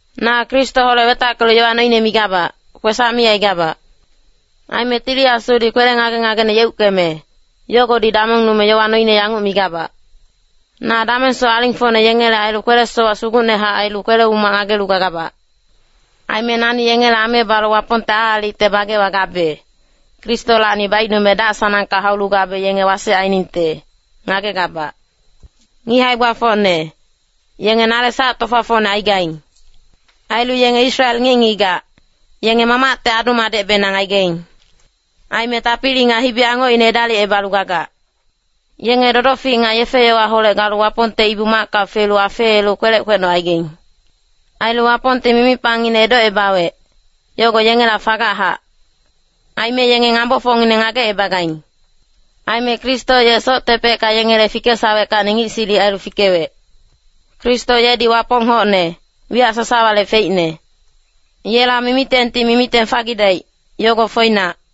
Na Kristoholec wetackelu yowa noine migabac, kwesac mi aigabac. Aime Tili Asudi kwele ngage-ngagene yeuckeme, yogodi damongnume yowa noine yanguc migabac. Na damengsoc alingfocne yengele ailu kwele-sowac sugucnehac ailu kwele-umac ngagelu gagabac. Aime nani yengele ame balu Wapongte aalicte bagewa gabe, Kristolacni baicnume dac-sanangka haulu gabe yenge wasec ainingte, ngagegabac. Ngic hae-gbafocne, yenge nale sac-tofafocne aigaing. Ailu yenge Israel ngic-ngigac, yenge Mamacte adu-madecbenang aigaing. Aime tapili nga hibi-angocine edalicebalu gagac. Yenge dodofic nga yefe-yowaholec galu Wapongte Ibu-macka felu afeelu kwelec kwecnocaigaing. Ailu Wapongti mimipangngine edocebawec, yogo yengela fagachac. Aime yenge ngambofocngineng ngagecebagaing. Aime Kristo ye soctepecka yengele fikesaweckacni ngic silic ailu fikewec. Kristo yedi Wapong hocne, wiyac sasawale feicne. Yela mimitengti mimiteng fagidaic, yogo foinac.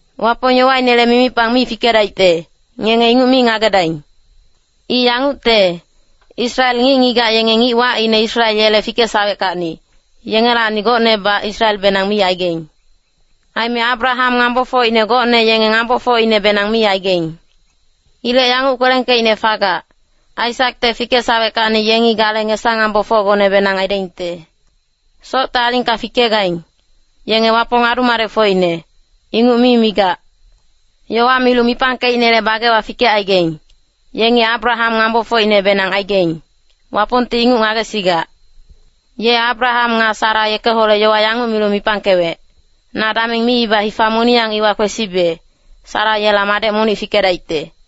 Wapong yowainele mimipang mi fikedaicte, ngenge inguc mi ngagedaing. I yangucte, Israel ngic-ngigac yenge ngic wacine Israel yele fikesaweckacni, yengelacni gocnebac Israelbenang mi aigaing. Aime Abraham ngambofocine gocne yenge ngambofocinebenang mi aigaing. Ilec yanguc kwelengkeicne fagac, “Aisakte fikesaweckacni yengi gale ngesa-ngambofocgonebenang aidaingte.” Socte alingka fikegaing, yenge Wapong adu-madecfocine, inguc mi migac. Yowa milu mipangkeicnele bagewa fikecaigaing, yengi Abraham ngambofocinebenang aigaing, Wapongti inguc ngagesigac. Ye Abraham nga Sara yekeholec yowa yanguc milu mipangkewec, “Na dameng miiba hifa moniyang iwa kwesibe, Sara yela madec monic fikedaicte.”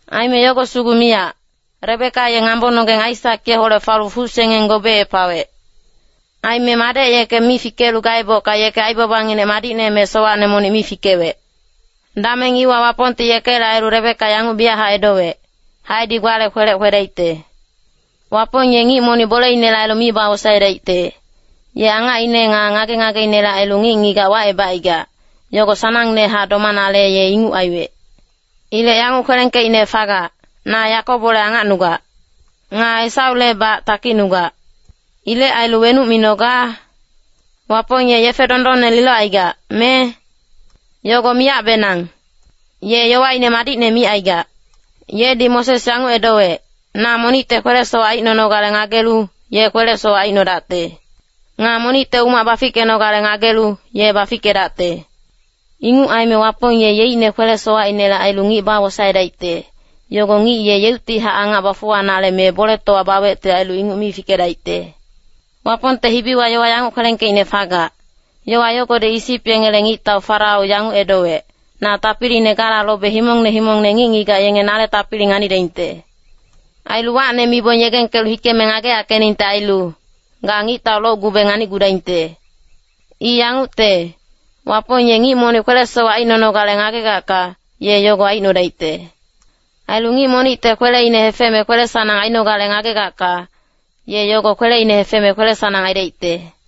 Aime yogo sugu miyac, Rebeka ye ngambononggeng Aisak yeholec falu fucsengeng gobeepawec. Aime madec yeke mi fikelu gaebocka yeke aibabanginec madicne me sowacne monic mi fikewec. Dameng iwa Wapongti yekele ailu Rebeka yanguc biyachac edowec, “Haedi gbale kwelec kwedaicte.” Wapong ye ngic monic boleinele ailu mi bawosaedaicte, ye angacine nga ngage-ngageinele ailu ngic-ngigac wacebacaigac, yogo sanangnehac domanale ye inguc aiwec. Ilec yanguc kwelengkeicne fagac, “Na Yakobole angacnugac. Nga Esaulebac takicnugac.” Ilec ailu wenuc minoga? Wapong ye yefe dondonne lilocaigac, me? Yogo miyacbenang. Ye yowaine madicne micaigac. Yedi Moses yanguc edowec, “Na monicte kwele-sowac aicnonogale ngagelu, ye kwele-sowac aicnodacte. Nga monicte umac bafickenogale ngagelu, ye bafickedacte.” Inguc aime Wapong ye yeicne kwele-sowacinele ailu ngic bawosaedaicte, yogo ngic ye yeuctihac angac bafuwanale me boletowa bawecte ailu inguc mi fikedaicte. Wapongte hibiwa yowa yanguc kwelengkeicne fagac, yowa yogodi Isip yengele ngictau Farao yanguc edowec, “Na tapiline gala lobe himongne himongne ngic-ngigac yenge nale tapili nganidaingte. Ailu wacne mibong yegengkelu hikeme ngageyackeningte ailu, ga ngictau locgube nganicgudaingte.” I yangucte, Wapong ye ngic monic kwele-sowac aicnonogale ngagegacka, ye yogo aicnodaicte. Ailu ngic monicte kweleine hefeme kwele-sanang ainogale ngagegacka, ye yogo kweleine hefeme kwele-sanang aidaicte.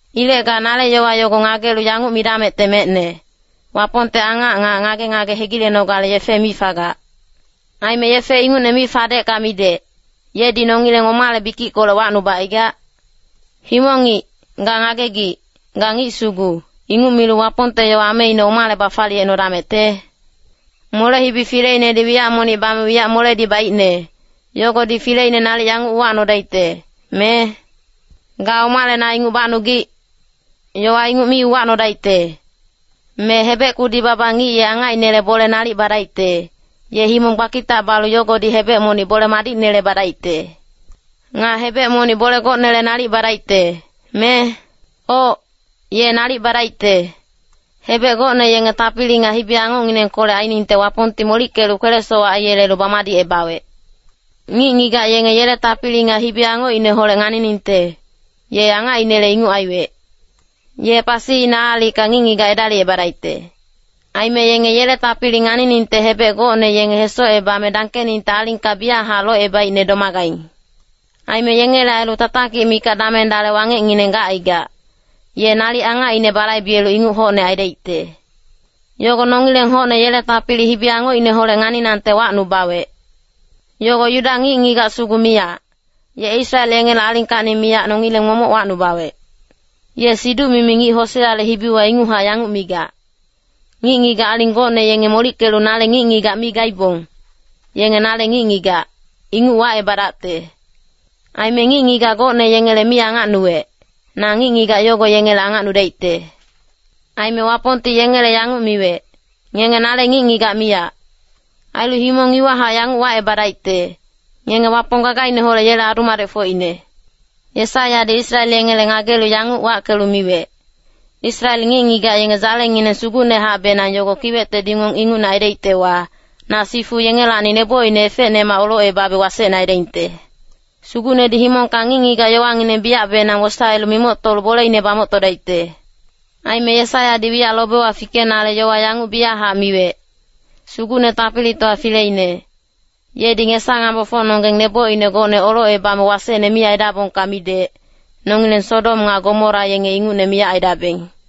Ilec ga nale yowa yogo ngagelu yanguc midamecte mecne, “Wapongte angac nga ngage-ngage hegilenogale yefe mi fagac. Aime yefe ingucne mi fadecka midec, yedi nongileng omale bikickolec wacnubacaigac?” Himong-ngic, ga ngagegic, ga ngic sugu, inguc milu Wapongte yowa ameine omale bafaliyecnodamecte? Mole-hibi fileinedi wiyac monic bame wiyac moledi baicne, yogodi fileine nalic yanguc uwacnodaicte, me? “Ga omale na inguc bacnugic?” Yowa inguc mi uwacnodaicte. Me hebec kudi-baba ngic ye angacinele bole nalic badaicte, ye himong gbakitac balu yogodi hebec monic bole madicnele badaicte. Nga hebec monic bole gocnele nalic badaicte, me? Oc, ye nalic badaicte. Hebec gocne yenge tapili nga hibi-angocnginengkolec ainingte Wapongti molickelu kwele-sowac aiyelelu bamadicebawec. Ngic-ngigac yenge yele tapili nga hibi-angocineholec nganiningte, ye angacinele inguc aiwec. Ye pasiine aalicka ngic-ngigac edalicebadaicte. Aime yenge yele tapili nganiningte hebec gocne yenge hesocebame dangkeningte alingka biyachac locebaicne domagaing. Aime yengele ailu tatakic mikac dameng dale wangecngineng gacaigac, ye nalic angacine balaibelu inguc hocne aidaicte. Yogo nongileng hocne yele tapili hibi-angocineholec nganinangte wacnubawec. Yogo Yuda ngic-ngigac sugu miyac, ye Israel yengele alingkacni miyac nongileng momoc wacnubawec. Ye siduc-mimi ngic Hoseale hibiwa inguchac yanguc migac, “Ngic-ngigac aling gocne yenge molickelu nale ngic-ngigac mi gaibong, yenge nale ngic-ngigac, inguc wacebadacte. Aime ngic-ngigac gocne yengele mi angacnuwec, na ngic-ngigac yogo yengele angacnudaicte.” “Aime Wapongti yengele yanguc miwec, ‘Ngenge nale ngic-ngigac miyac.’ Ailu himong iwahac yanguc wacebadaicte, ‘Ngenge Wapong gagaineholec yele adu-madecfocine.’” Yesaiyadi Israel yengele ngagelu yanguc wackelu miwec, “Israel ngic-ngigac yenge dzalengineng sugucnehacbenang yogo kiwecte dingong ingucne aidaictewa, na sifu yengelacni nebocine efecnemac olocebabe wasecne aidaingte. Sugucnedi himongka ngic-ngigac yowangineng biyacbenang wosaelu mimoctolu boleine bamoctodaicte.” Aime Yesaiyadi wiyac lobewa fikenale yowa yanguc biyachac miwec, “Sugucne Tapilitowa Fileine, yedi ngesa-ngambofocnonggeng nebocine gocne olocebame wasecne mi aidabongka midec, nongileng Sodom nga Gomora yenge ingucne miyac aidabeng.”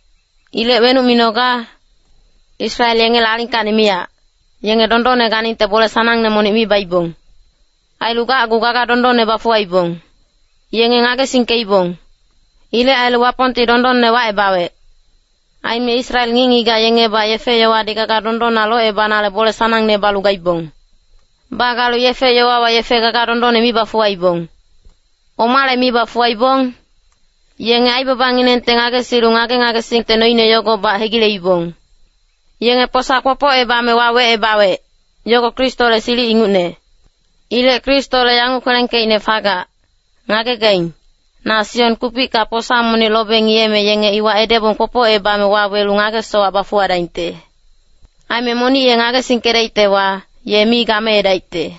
Ilec wenuc minoga? Israel yengele alingkacni miyac, yenge dondonne ganingte bole sanangne monic mi baibong. Ailu gacgu gaga dondonne bafuwaibong. Yenge ngagesingkeibong. Ilec ailu Wapongti dondonne wacebawec. Aime Israel ngic-ngigac yengebac yefe-yowadi gaga dondonna locebanale bole sanangne balu gaibong. Bagalu yefe-yowawa yefe gaga dondonne mi bafuwaibong. Omale mi bafuwaibong? Yenge aibabanginengte ngagesilu ngage-ngagesingte noine yogobac hegileibong. Yenge posa kwopocebame wawecebawec, yogo Kristole silic ingucne. Ilec Kristole yanguc kwelengkeicne fagac, “Ngagegaing, na Sion kupicka posa monic lobe ngiyeme yenge iwa edebong kwopocebame wawelu ngage-sowac bafuwadaingte. Aime monic ye ngagesingkedaictewa, ye mi gameedaicte.”